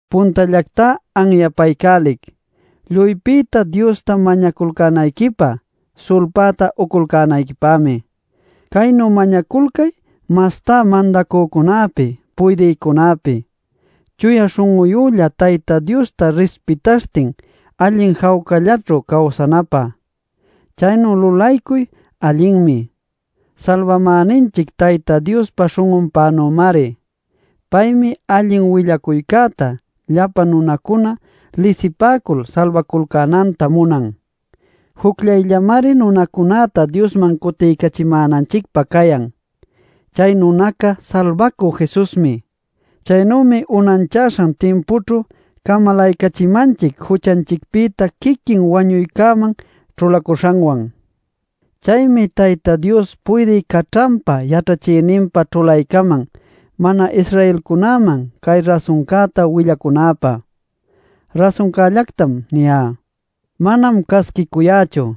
Puntallactá anyapaycälic, lluypïta Diosta mañaculcänayquipä, sulpäta uculcänayquipämi. Caynu mañaculcay mastá mandacücunäpi puydïcunäpi, chuya śhun'uyülla Tayta Diosta rispitaśhtin allin jawcallaćhu cawsanapä. Caynu lulaycuy allinmi, salbamäninchic Tayta Diospa śhun'unpänümari. Paymi allin willacuycäta llapa nunacuna lisipäcul salbaculcänanta munan. Jucllayllamari nunacunäta Diosman cutiycachimänanchicpä cayan. Chay nunaca salbacü Jesusmi. Chaynümi unanchaśhan timpućhu camalaycachimanchic juchanchicpïta quiquin wañuycäman ćhulacuśhanwan. Chaymi Tayta Dios puydï caćhanpä yaćhachïninpä ćhulaycaman mana-Israelcunäman cay rasuncäta willaycunäpä. Rasuncällactam niyá; manam casquicuyächu.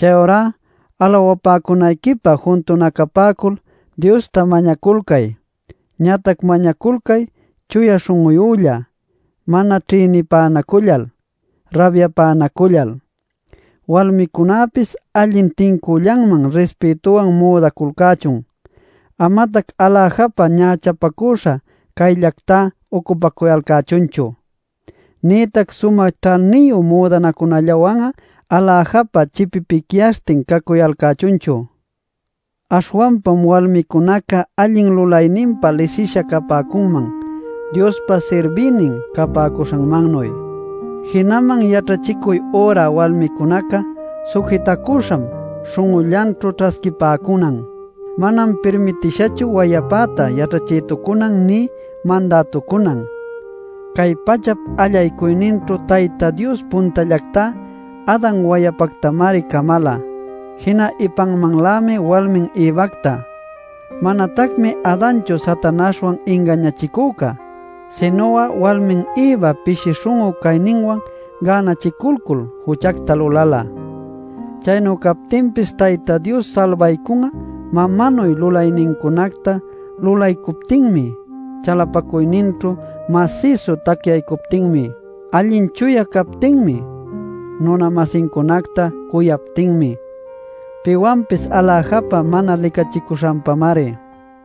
Chayurá alawapäcunayquipä juntunacapäcul Diosta mañaculcay, ñatac mañaculcay chuya śhun'uyülla, mana ćhïnipänacullal, rabyapänacullal. Walmicunäpis allin tincüllanman rispïtuwan müdaculcächun. Amatac aläjapä ñächapacüśha cayllactá ucupacuyalcächunchu; nïtac sumä ćhaniyu müdanacunallawan'a aläjapä chipipicyaśhtin cacuyalcächunchu. Aśhwanpam walmicunaca allin lulayninpa lisisha capäcunman Diospa sirbïnin capäcuśhanmannuy. Jinaman yaćhachicuy üra walmicunaca sujitacüśham śhun'ullanćhu ćhasquipäcunan. Manam pirmitishachu wayapäta yaćhachïtucunan nï mandätucunan. Cay pachap allaycuyninćhu Tayta Dios puntallactá Adan wayapactamari camala, jina ipanmanlämi walmin Evacta. Manatacmi Adanchu Satanaśhwan ingañachicücá, sinu'a walmin Evam pishi śhun'u cayninwan gänachiculcul juchacta luläla. Chaynu captinpis Tayta Dios salbaycun'a mamanuy lulaynincunacta lulaycuptinmi chalapacuyninćhu masïsu tacyaycuptinmi, allin chuya captinmi, nuna-masincunacta cuyaptinmi, piwanpis aläjapä mana licachicuśhanpamari.